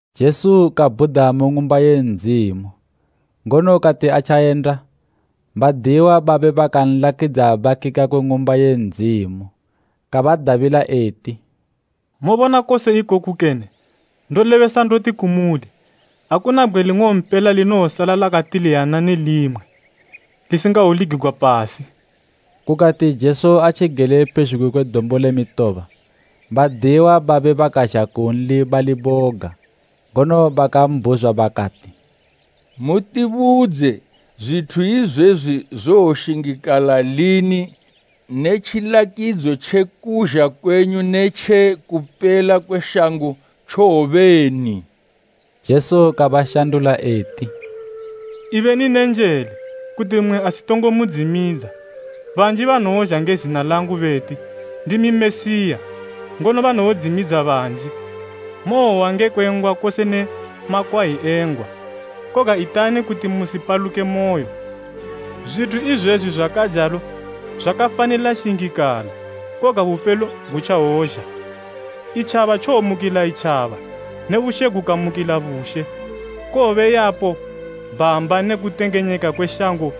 Jesu kabhuda mu Ng'umba ye Ndzimu, ngono kati atjayenda badiyiwa babe bakanlakidza bakika kwe Ng'umba ye Ndzimu. Kabadabila eti, “Mobona kose ikoku kene? Ndolebesa ndoti kumuli, akuna bgwe ling'ompela linowosala lakatiliyana ne limwe, lisingawoligigwa pasi.” Kukati Jesu atjigele pezhugwi kwe Dombo le Mitoba, badiyiwa babe bakazha kunli bali boga, ngono bakambhuzwa bakati, “Mutibudze, zwithu izwezwi zowoshingikala lini ne tjilakidzo tje kuzha kwenyu ne tje kupela kwe shango tjowobeni?” Jesu kabashandula eti, “Ibeni ne njele kuti mmwe asitongo mudzimidza. Banji banowozha nge zina langu beti, ‘Ndimi Mesiya,’ ngono banowodzimidza banji. Mowohwa ngekwe ngwa kose ne makwayi e ngwa, koga itani kuti musipaluke moyo. Zwithu izwezwi zwakajalo zwakafanila shingikala, koga bupelo gutjawozha. Itjaba tjowomukila itjaba ne bushe gukamukila bushe. Kowobe yapo bhamba ne kutengenyeka kwe shango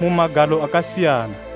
mu magalo akasiyana.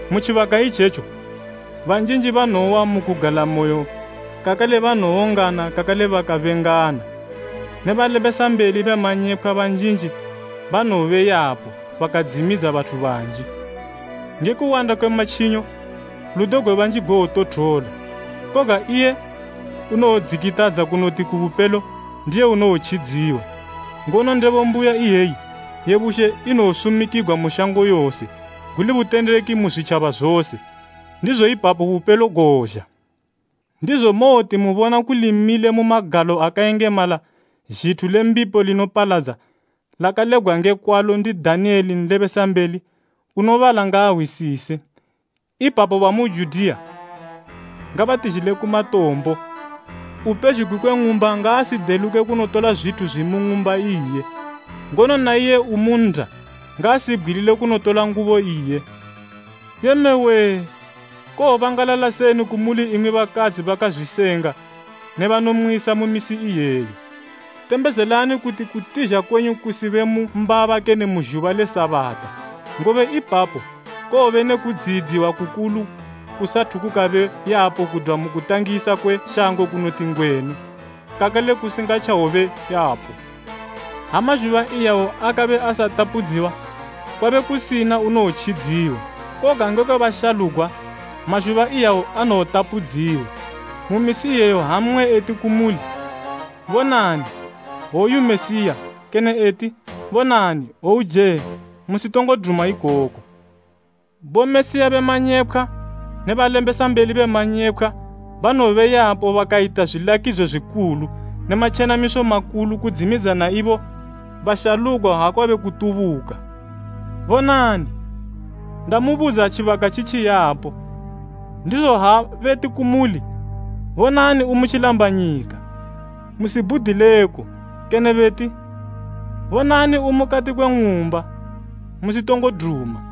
Mu tjibaka itjetjo banjinji banowowa mu kugalamoyo kakale banowongana kakale bakabengana. Ne balebesambeli be manyepkhwa banjinji banowobe yapo bakadzimidza bathu banji. Nge kuwanda kwe matjinyo, ludo gwe banji gowotothola. Koga iye unowodzikitadza kunoti ku bupelo ndiye unowotjidziwa. Ngono ndebo mbuya iyeyi ye bushe inowosumikigwa mu shango yose, guli butendeki mu zwitjaba dzose, ndizo ipapo bupelo gowozha. “Ndizo mowoti mubona kuli mile mu magalo akayengemala ‘Zhithu le mbipo linopaladza,’ lakalebgwa nge kwalo ndi Daniyele nlebesambeli (unobala ngaahwisise), ipapo bamu Judiya ngabatizhile ku matombo. Upezhugwi kwe ng'umba ngaasideluke kunotola zwithu zwimu ng'umba iye. Ngono na iye umu nnda ngaasibgwilile kunotola ngubo iye. Yee mme wee! Kowobangalala seni kumuli imwi bakadzi bakazwisenga ne banomwisa mu misi iyeyo. Tembezelani kuti kutizha kwenyu kusibe mu mbaba kene mu zhuba le Sabata; ngobe ipapo kowobe ne kudziyidziwa kukulu kusathu kukabe yapo kudwa mu kutangisa kwe shango kuwoti ngwenu, kakale kusingatjawobe yapo. Ha mazhuba iyawo akabe asatapudziwa, kwabe kusina unowotjidziwa. Koga ngekwe bashalugwa, mazhuba iyawo anowotapudziwa. “Mu misi iyeyo ha mmwe eti kumuli, ‘Bonani woyu Mesiya kene eti, bonani hwouje,’ musitongo duma ikoko. Bomesiya be manyepkhwa ne balebesambeli be manyepkhwa banowobe yapo bakayita zwilakidzo zwikulu ne matjenamiso makulu kudzimidza na ibo bashalugwa ha kwabe kutubuka. Bonani, ndamubudza tjibaka tjitjiyapo. “Ndizo ha beti kumuli, ‘Bonani umu tjilambanyika,’ musibhudileko. Kene beti, ‘Bonani, umukati kwe ng'umba,’ musitongo duma,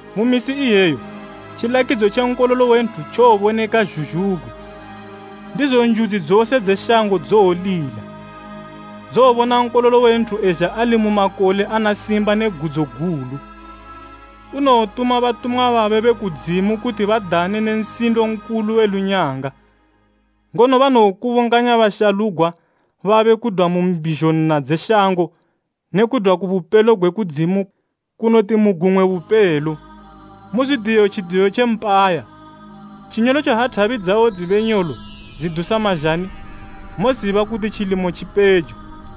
Mu misi iyeyo tjilakidzo tje Nkololo we Nthu tjowoboneka zhuzhugwi, ndizo njudzi dzose dze shango dzowolila. Dzowobona Nkololo we Nthu ezha ali mu makole ana simba ne gudzo gulu. Unowotuma batumwa babe be kudzimu kuti badane ne nsindo nkulu we lunyanga, ngono banowokubunganya bashalugwa babe kudwa mu mbizho nna dze shango ne kudwa ku bupelo gwe kudzimu kunoti mu gumwe bupelo. “Muzwidiye tjidiyo tje mpaya, tjinyolotjo ha thabi dzawo dzibe nyolo dzidusa mazhani, moziba kuti tjilimo tji pejo.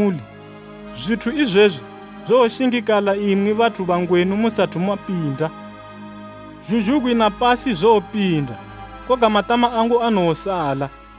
Ndolebesa ndoti kumuli, zwithu izwezwi zowoshingikala imwi bathu bangwenu musathu mapinda. Zhuzhugwi ne pasi zowopinda koga matama angu anowosala.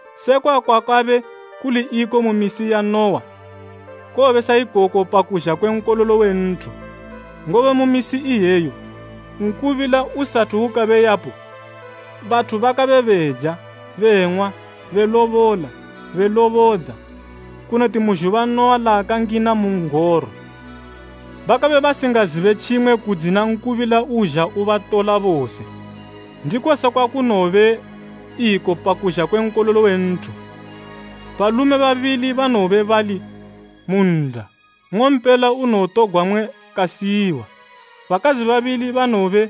Sekwa kwakabe kuli iko mu misi ya Nuwa, kowobe sa ikoko pa kuzha kwe Nkololo we Nthu. Ngobe mu misi iyeyo, nkubila usathu ukabe yapo bathu bakabe beja, beng'wa, belobola, belobodza, kunoti mu zhuba Nuwa laakangina mu n'goro. Bakabe basingazibe tjimwe kudzina nkubila uzha ubatola bose. Ndiko sekwa kunowobe iko pa kuzha kwe Nkololo we Nthu. Balume babili banowobe bali mu nnda, nng'ompela unowotogwa mmwe kasiyiwa. Bakadzi babili banowobe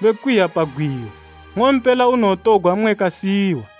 bekwiya pa gwiyo, nng'ompela unowotogwa mmwe kasiyiwa.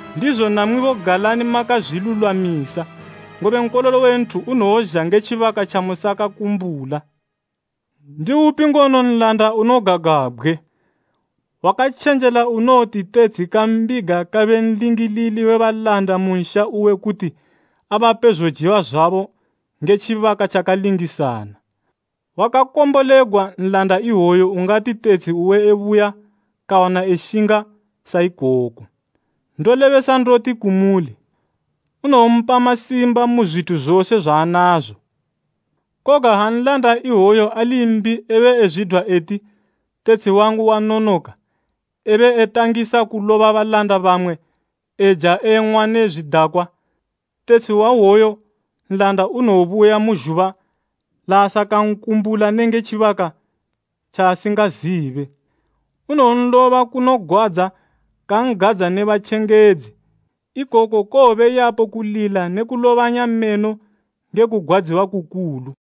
Ndizo namwibo galani makazwilulwamisa, ngobe Nkololo we Nthu unowozha nge tjibaka tjamusakakumbula. “Ndiupi ngono nlanda unogagwabgwe, wakatjenjela unowoti tetshi kambiga kabe nlingilili we balanda mu nsha uwe kuti abape zojiwa zwabo nge tjibaka tjakalingisana? Wakakombolegwa nlanda iwoyo ungati tetshi uwe ebuya kawana eshinga sa ikoko. Ndolebesa ndoti kumuli, unowompa masimba mu zwithu zose zwaanazo. Koga ha nlanda iwoyu ali mbi ebe ezwidwa eti, ‘Tetshi wangu wanonoka,’ ebe etangisa kuloba balanda bamwe, eja eng'wa ne zwidakwa, tetshi wa iwoyo nlanda unowobuya mu zhuba laasakankumbula nenge tjibaka tjaasingazibe. Unowonloba kunogwadza kan'gadza ne batjengedzi. Ikoko kowobe yapo kulila ne kulobanya meno nge kugwadziwa kukulu.